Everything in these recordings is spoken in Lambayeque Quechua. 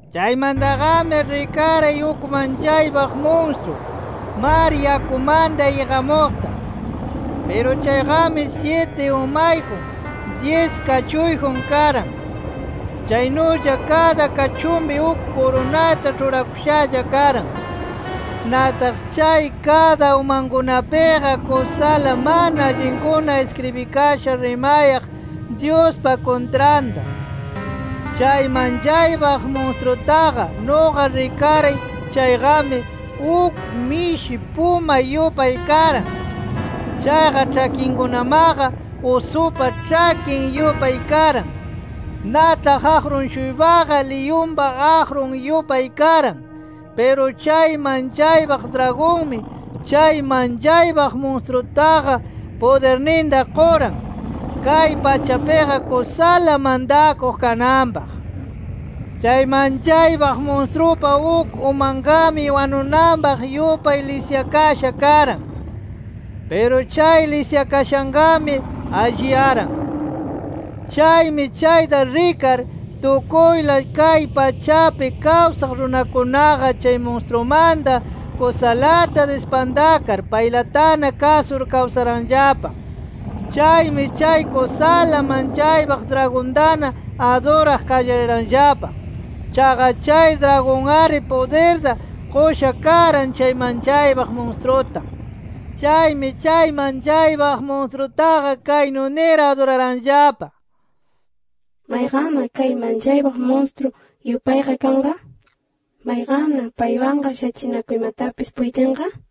Chaymantaqami rikaray uk manchaypaq munstru, mar yakumanta iqamuqta. Piru chayqami syiti umayjun, dyis kachuyjun karan. Chaynulla kada kachunpi uk kurunata ĉhurakushalla karan. Nataq chay kada umankunapiqa, kusala mana allinkuna iskribikasha rimayaq Dyuspa kuntranta. Chay manchaypaq munstrutaqa, nuqa rikaray chayqami, uk mishi puma yupay karan. Chaqa ĉhakinkunamaqa usupa ĉhakin yupay karan. Nataq aqrun-shuypaqa liyunpa aqrun yupay karan. Piru chay manchaypaq dragonmi, chay manchaypaq munstrutaqa pudirninta quran, kay pachapiqa kusala mantakuq kananpaq. Chay manchaypaq munstrupa uk umanqami wanunanpaq yupay lisyakasha karan. Piru chay lisyakashanqami alliyaran. Chaymi chayta rikar, tukuyla kay pachapi kawsaq runakunaqa chay munstrumanta kusalata dispantakar, paylatana kasur kawsaranllapa. Chaymi chay kusala manchaypaq dragontana aduraq qallariranllapa. Chaqa chay dragon-ari pudirta qusha karan chay manchaypaq munstruta. Chaymi chay manchaypaq munstrutaqa kaynu nir aduraranllapa: “¿Mayqanna kay manchaypaq munstru yupayqa kanqa? ¿Mayqanna paywanqa shachinakuymatapis puytinqa?” nir.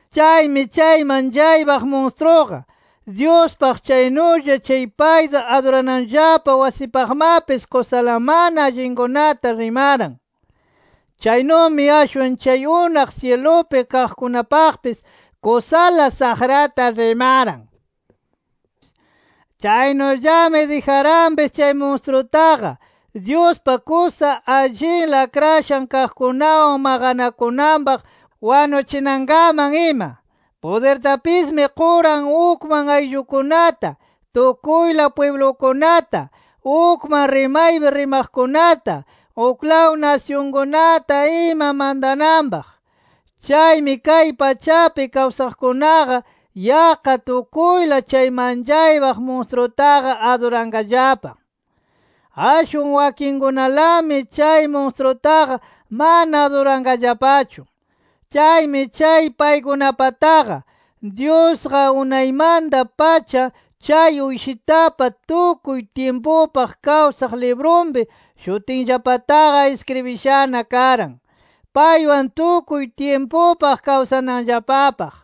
Chaymi chay manchaypaq munstruqa, Dyuspaq chaynulla chay payta adurananllapa wasipaqmapis kusala mana allinkunata rimaran. Chaynumi ashwan chay unaq syilupi kaqkunapaqpis, kusala saqrata rimaran. Chaynullami dijaranpis chay munstrutaqa, Dyuspa kusa allinla akrashan kaqkunawan maqanakunanpaq wanuchinankaman ima. Pudirtapismi quran ukman ayllukunata, tukuyla pwiblukunata, ukman rimaypi rimaqkunata, uklaw nasyunkunata ima mantananpaq. Chaymi kay pachapi kawsaqkunaqa yaqqa tukuyla chay manchaypaq munstrutaqa aduranqallapa. Ashwan wakinkunalami chay munstrutaqa mana aduranqallapachu. Chaymi chay paykunapataqa, Dyusqa unaymanta-pacha chay Uyshitapa tukuy tyimpupaq kawsaq librunpi shutinllapataqa iskribishana karan, paywan tukuy tyimpupaq kawsananllapapaq.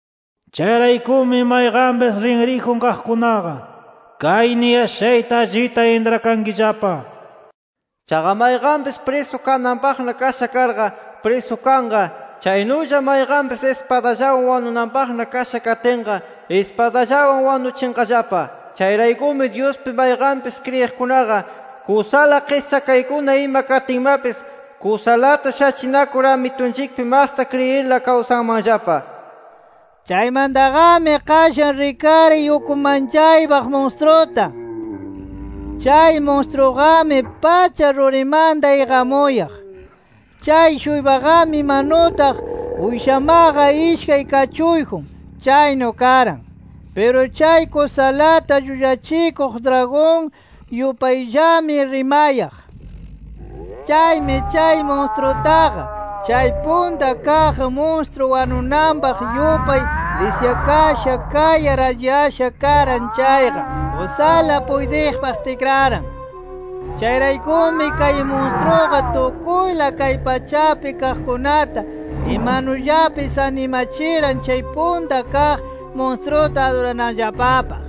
Chayraykumi mayqanpis rinriyjun kaqkunaqa, kay niyashayta allita intrakankillapa: “Chaqa mayqanpis prisu kananpaqna kasha karqa prisukanqa. Chaynulla mayqanpis ispadallawan wanunanpaq kasha katinqa, ispadallawan wanuchinqallapa”. Chayraykumi, Dyuspi mayqanpis kriyiqkunaqa kusala qischakaykuna ima katinmapis, kusalata shachinakur Amitunchikpi masta kriyirla kawsanmanllapa. Chaymantaqami qashan rikaray uk manchaypaq munstruta. Chay munstruqami pacha rurimanta iqamuyaq. Chay-shuypaqami imanutaq uyshamaqa ishkay kachuyjun, chaynu karan. Piru chay kusalata llullachikuq dragon yupayllami rimayaq. Chaymi kay munstrutaqa, chay punta kaq munstru wanunanpaq yupay lisyakasha kayar alliyasha karan chayqa, kusala puytiqpaq tikraran. Chayraykumi kay munstruqa tukuyla kay pachapi kaqkunata imanullapis animachiran chay punta kaq munstruta adurananllapapaq.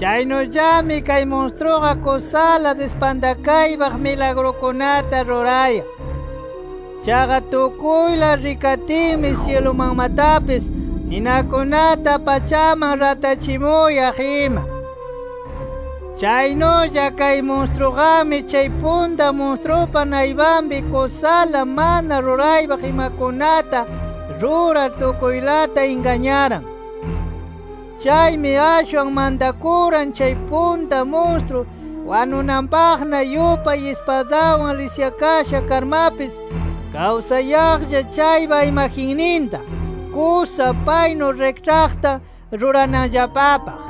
Chaynullami kay munstruqa kusala dispantaypaq milagrukunata rurayaq. Chaqa tukuyla rikatinmi syilumanmatapis ninakunata pachaman ratachimuyaq ima. Chaynulla kay munstruqami chay punta munstrupa naypanpi kusala mana ruraypaq imakunata rurar tukuylata ingañaran. Chaymi ashwan mantakuran chay punta munstru wanunanpaqna yupay ispadawan lisyakasha karmapis kawsayaqlla chaypa imagenninta kusa paynu rikĉhaqta rurananllapapaq.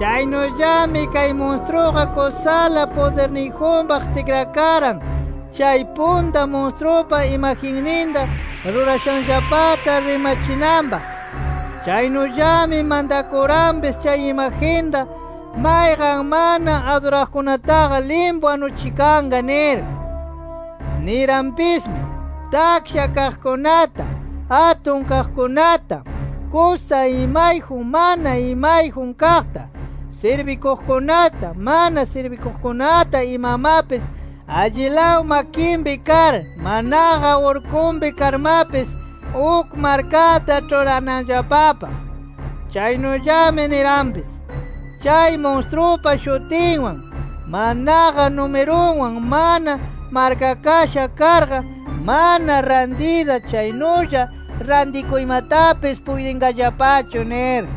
Chaynullami kay munstruqa kusala pudirniyjunpaq tikrakaran chay punta munstrupa imagenninta rurashanllapata rimachinanpaq. Chaynullami mantakuranpis chay imagenta mayqan mana aduraqkunataqa limpu wanuchikanqa nir. Niranpismi: Taksha kaqkunata, atun kaqkunata, kusa imayjun, mana imayjun kaqta, sirbikuqkunata, mana sirbikuqkunata imamapis allilaw makinpi kar manaqa urkunpi karmapis, uk markata ĉhurananllapapaq. Chaynullami niranpis: Chay munstrupa shutinwan, manaqa numirunwan mana markakasha karqa, mana rantiyta, chaynulla rantikuymatapis puytinqallapachu nir.